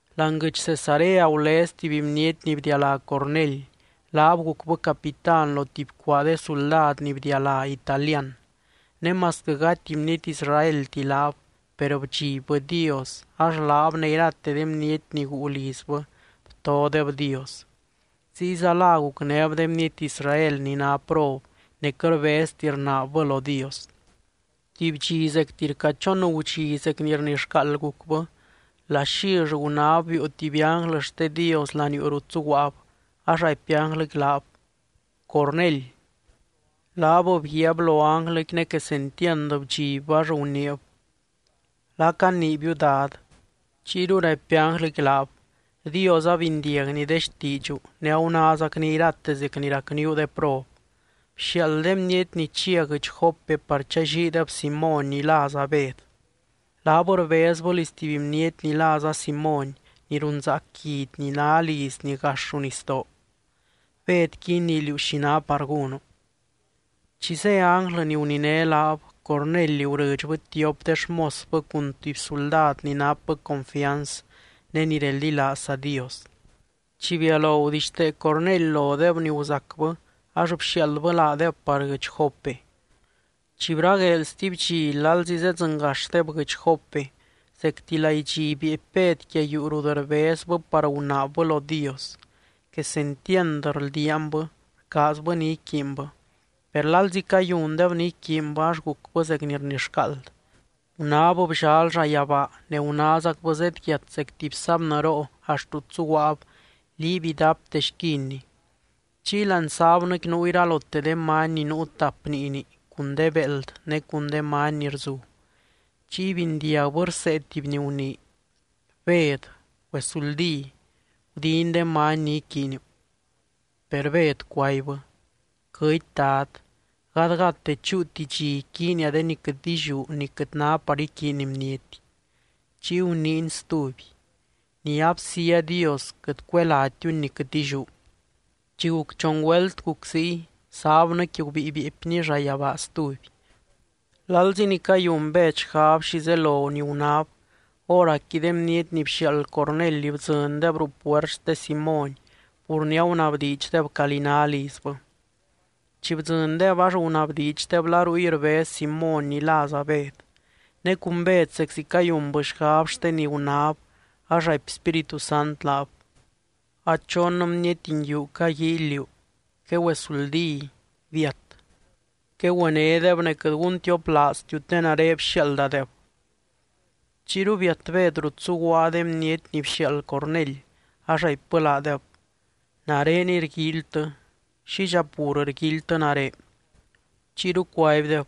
Láani guɨdx Cesarea gulez tuby bniety ni bdialá Cornely. Laab gucbɨ capitán lo tuby cuaa de suldad ni bdialá Italian. Ne masquɨ gati bniety Israelti laab, per bdxibbɨ Dios, ax laab ne irate de bniety ni guu lizbɨ btodeb Dios. Ziyza la gucnéb de bniety Israel ni ná prob, ne quɨt rbezti rnaabbɨ lo Dios. Tuby dxi zecti rca chon gudxi zec ni rnixcaald gucbɨ. Laxill gunáb biiu tuby ánglɨ xte Dios laniuu rut zuguaab, ax raipy ánglɨqui laab: —¡Cornely! Laab bguiaab lo ánglɨqui ne quesentiand bdxibbɨ ax guniib: —¿La caniibiu, Dad? Chiyru raipy ánglɨqui laab: —Dios abindiagny de xtiidxu ne agunázacny irate zec ni racníu de prob. Bxiaald de bniety ni chia guɨdx Jope par challiideb Simóny ni láza Bed. Laab rbezbɨ liz tuby bniety ni láza Simóny, ni runzaac guidy ni ná lizni gax ruu nisdoo. Bedqui inii liú xi ná par gúnu. Chi zé ánglɨ ni guniné laab, Cornely gurɨdxbɨ tiop de xmosbɨ cun tuby suldad ni napbɨ confianz ne ni reldilaazza Dios. Chi bialo gudixtee Cornely lodeb ni guzacbɨ ax bxiaaldbɨ laadeb par guɨdx Jope. Chi bragueel stuby dxi lalzi zedzɨngaxdeb guɨdx Jope, zecti laidxi bieepy Bed quia yuu rut rbezbɨ par gunaabbɨ lo Dios. Quesentiand rldiaanbɨ. Rcaazbɨ ni iquiinbɨ. Per lalzi cayundeb ni iquiinbɨ, ax gucbɨ zec ni rnixcaald. Gunáb bllal llayabaa ne gunázacbɨ zedyiat zec tuby sábnɨroo axt rut zuguaab, liiby idapte xquinni. Chiy láani sábnɨqui nuu iralote de many ni nuu tap niini, cun de béeld ne cun de many ni rzu. Chiy bindiagbɨ rsee tuby ni gunii: —Bed, güesuldí. Gudin de many ni iquiiniu. Per Bed cuaibbɨ: —Quɨty, Dad. Gadgadte chúuti dxi iquiinia de ni quɨt illiú ni quɨt ná par iquiiny bniety. Chiy guniiny stuby: —Ni absía Dios, quɨt cuelátiuni ni quɨt illiú. Chi guc chon güelt guc ziy, sábnɨqui gubíi bieepni llayabaa stuby. Lalzi ni cayun Bed xgab xi zelo ni gunáb, hóracqui de bniety ni bxiaald Cornely bdzɨndeb ruu puert xte Simóny, pur ni agunabdiidxdeb calí ná lizbɨ. Chi bdzɨndeb ax gunabdiidxdeb la ruy rbez Simóny ni láza Bed. Ne cun Bed zeczi cayunbɨ xgab xte ni gunáb, ax raipy Spíritu Sant laab: —A chon bniety nguiu caguíily liú. Quegüesuldí. Biat. Quegüenédeb ne quɨt guntioplaaztiu te nare bxiaaldadeb. Chiyru biat Bed rut zuguaa de bniety ni bxiaald Cornely, ax raipbɨ laadeb: —Nareniy rguíilytɨ. ¿Xidxa pur rguíilytɨ nare? Chiyru cuaibdeb: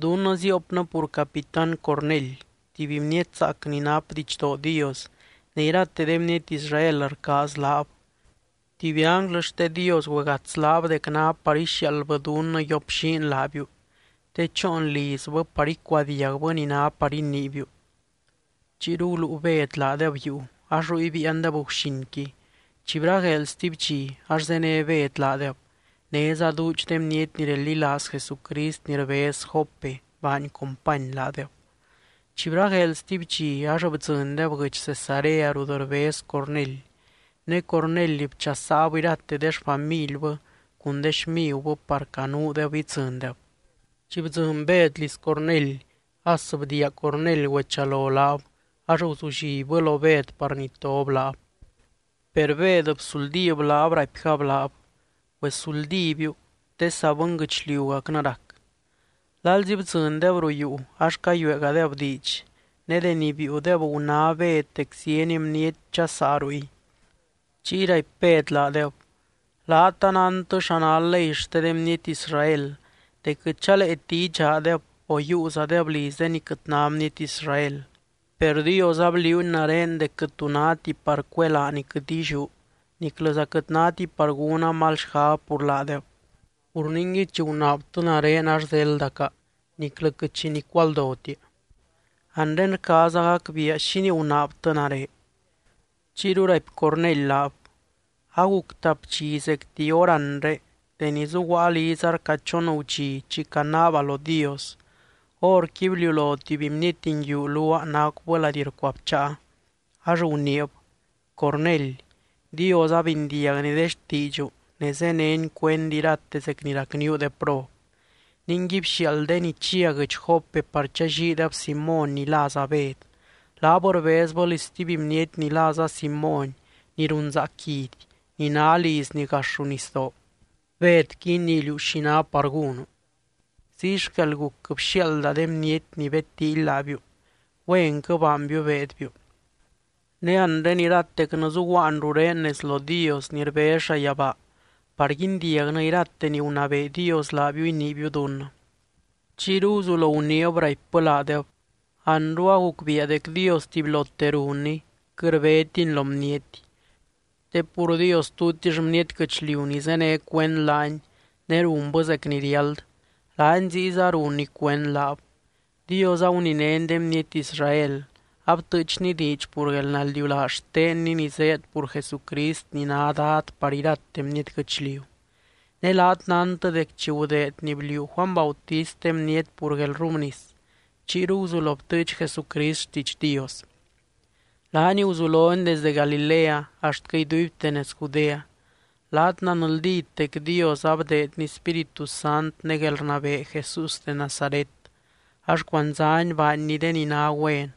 —Dunnɨ ziopnɨ pur Capitán Cornely, tuby bniety zaac ni nap didxdoo Dios, ne irate de bniety Israel rcaaz laab. Tuby ánglɨ xte Dios güegats laab dec ná par ixiaaldbɨ dunnɨ yioplliin laabiu te choon lizbɨ par icuadiagbɨ ni ná par iniibiu. Chiyru guluu Bed laadeb yuu, ax ruy biiandeb guxinqui. Chi bragueel stuby dxi, ax zéne Bed laadeb. Néza duudx de bniety ni reldilaaz Jesucrist ni rbez Jope baany company laadeb. Chi bragueel stuby dxi ax bdzɨndeb guɨdx Cesarea rut rbez Cornely. Ne Cornely bchasaab irate de xfamilbɨ cun de xmigubɨ par canuudeb idzɨndeb. Chi bdzɨny Bed liz Cornely, as bdiia Cornely güechalo laab, ax guzullibbɨ lo Bed par nitob laab. Per Bed bsuldíb laab, raipgab laab: —Güesuldíbiu, te saa bɨnguɨchliugacnɨ rac. Lalzi bdzɨndeb ruu yuu ax cayueegadeb diidx. Ne deni biiudeb, guná Bed dec zieny bniety dxasaa ruy. Chiy raipy Bed laadeb: —Laat anántɨ xa ná ley xte de bniety Israel dec quɨt chaleeti idxaadeb, o yiiuzadeb liz de ni quɨt ná bniety Israel. Per Dios abliuuny nare dec quɨt tu náti par cuelaa ni quɨt illiú, niclɨza quɨt náti par gúna mal xgab pur laadeb. Pur ningui, chi gunaabtɨ nare ax zéldaca, niclɨ quɨt xi nicualdotia. Anre rcaaza gacbiia, ¿xínii gunaabtɨ nare? Chiyru raipy Cornely laab: —Aguc tap dxi zecti hóranre, deni zuguaa liza rca chon gudxi chi canaaba lo Dios, horqui bliulo tuby bniety nguiu luaa nacubɨ lady rcuabcháa, ax guniib: “Cornely, Dios abindiagny de xtiidxu ne zéneny cuend irate zec ni racníu de prob. Ningui bxiaald de ni chia guɨdx Jope par challiideb Simóny ni láza Bed. Laab rbezbɨ liz stuby bniety ni láza Simóny ni runzaac guidy, ni ná lizni gax ruu nisdoo. Bedqui inii liú xi ná par gúnu.” Ziy xquel guc, bxiaalda de bniety ni bedtíily laabiu. Güenquɨ baanbiu beedbiu. Ne anre iratecnɨ zuguaan rurén nez lo Dios ni rbez llayabaa par guindiagnɨ irate ni gunabee Dios laabiu iniibiu dunnɨ. Chiyru guzulo guniib, raipbɨ laadeb: —Anru agucbiia dec Dios tubylote runny, quɨt rbétiny lo bniety. Te pur Dios tutix bniety guɨchliu ni zéne cuend laany ne runbɨ zec ni riáld, laany ziyza runny cuend laab. Dios aguninény de bniety Israel, abtɨɨchny diidx pur guelnaldiulaaz xtenny ni zéed pur Jesucrist ni ná Dad par irate bniety guɨchliu. Ne laat nántɨ dec chi gudeed ni bliuu Juany Bautist de bniety pur guelrrubnis, chiyru guzulo btɨɨch Jesucrist xtiidx Dios. Laany guzulony desdɨ Galilea axtquɨ iduibte nez Judea. Laat nanldít dec Dios abdeedny Spíritu Sant ne guelrnabee Jesús de Nazaret, ax cuandzány baanny de ni ná güen,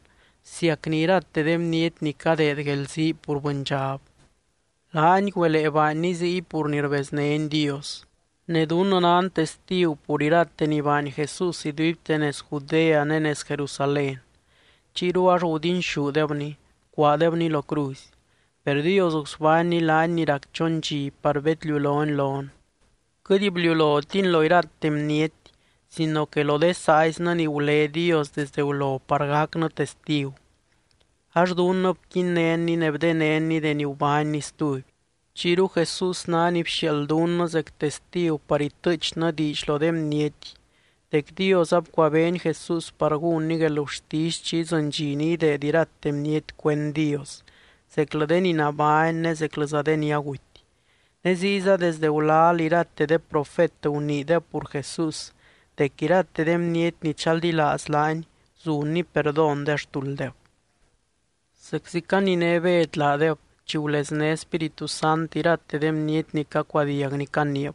bsiacny irate de bniety ni cadeed guelzii pur bɨndxab. Laany güelee baanny ziy pur ni rbeznény Dios. Ne dunnɨ nan testigu pur irate ni baany Jesús iduibte nez Judea ne nez Jerusalén. Chiyru ax gudinxúdebny, bcuaadebny lo cruzy. Per Dios gusbánny laany ni rac chon dxi par bedliulony lon. Quɨt bliulotiny lo irate bniety sino que lo de saaiznɨ ni gulé Dios desde gulo par gacnɨ testigu. Ax dunnɨ bquinnénny ne bdenénny deni gubánny stuby. Chiyru Jesús ná ni bxiaald dunnɨ zec testigu par itɨɨchnɨ diidx lo de bniety dec Dios abcuabeeny Jesús par gúnny guelgurtisy chi idzɨny dxi ni ideed irate bniety cuend Dios, zeclɨ de ni nabány ne zeclɨza de ni aguty. Ne ziyza desdɨ gulal irate de profet guniideb pur Jesús dec irate de bniety ni chaldilaaz laany, zunny perdón de xtulddeb. Zeczi caniné Bed laadeb, chi gulezné Spíritu Sant irate de bniety ni cacuadiag ni caniib.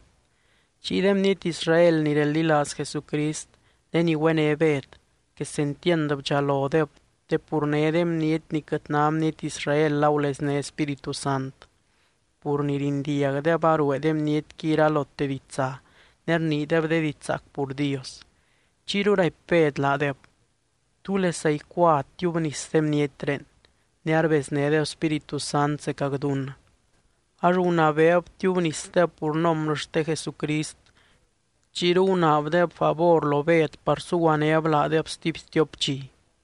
Chiy de bniety Israel ni reldilaaz Jesucrist de ni güené Bed, quesentiand bdxalodeb te pur né de bniety ni quɨt ná bniety Israel agulezné Spíritu Sant, pur ni rindiagdeb aruee de bnietqui iralote ditsa ne rniideb de diidx zaac pur Dios. Chiyru raipy Bed laadeb: —¿Túlesa icua tiubnis de bnietré, ne arbeznédeb Spíritu Sant zecac dunnɨ? Ax gunabeeb tiubnisdeb pur nombrɨ xte Jesucrist. Chiyru gunaabdeb favor lo Bed par suguanéb laadeb stuby stiop dxi.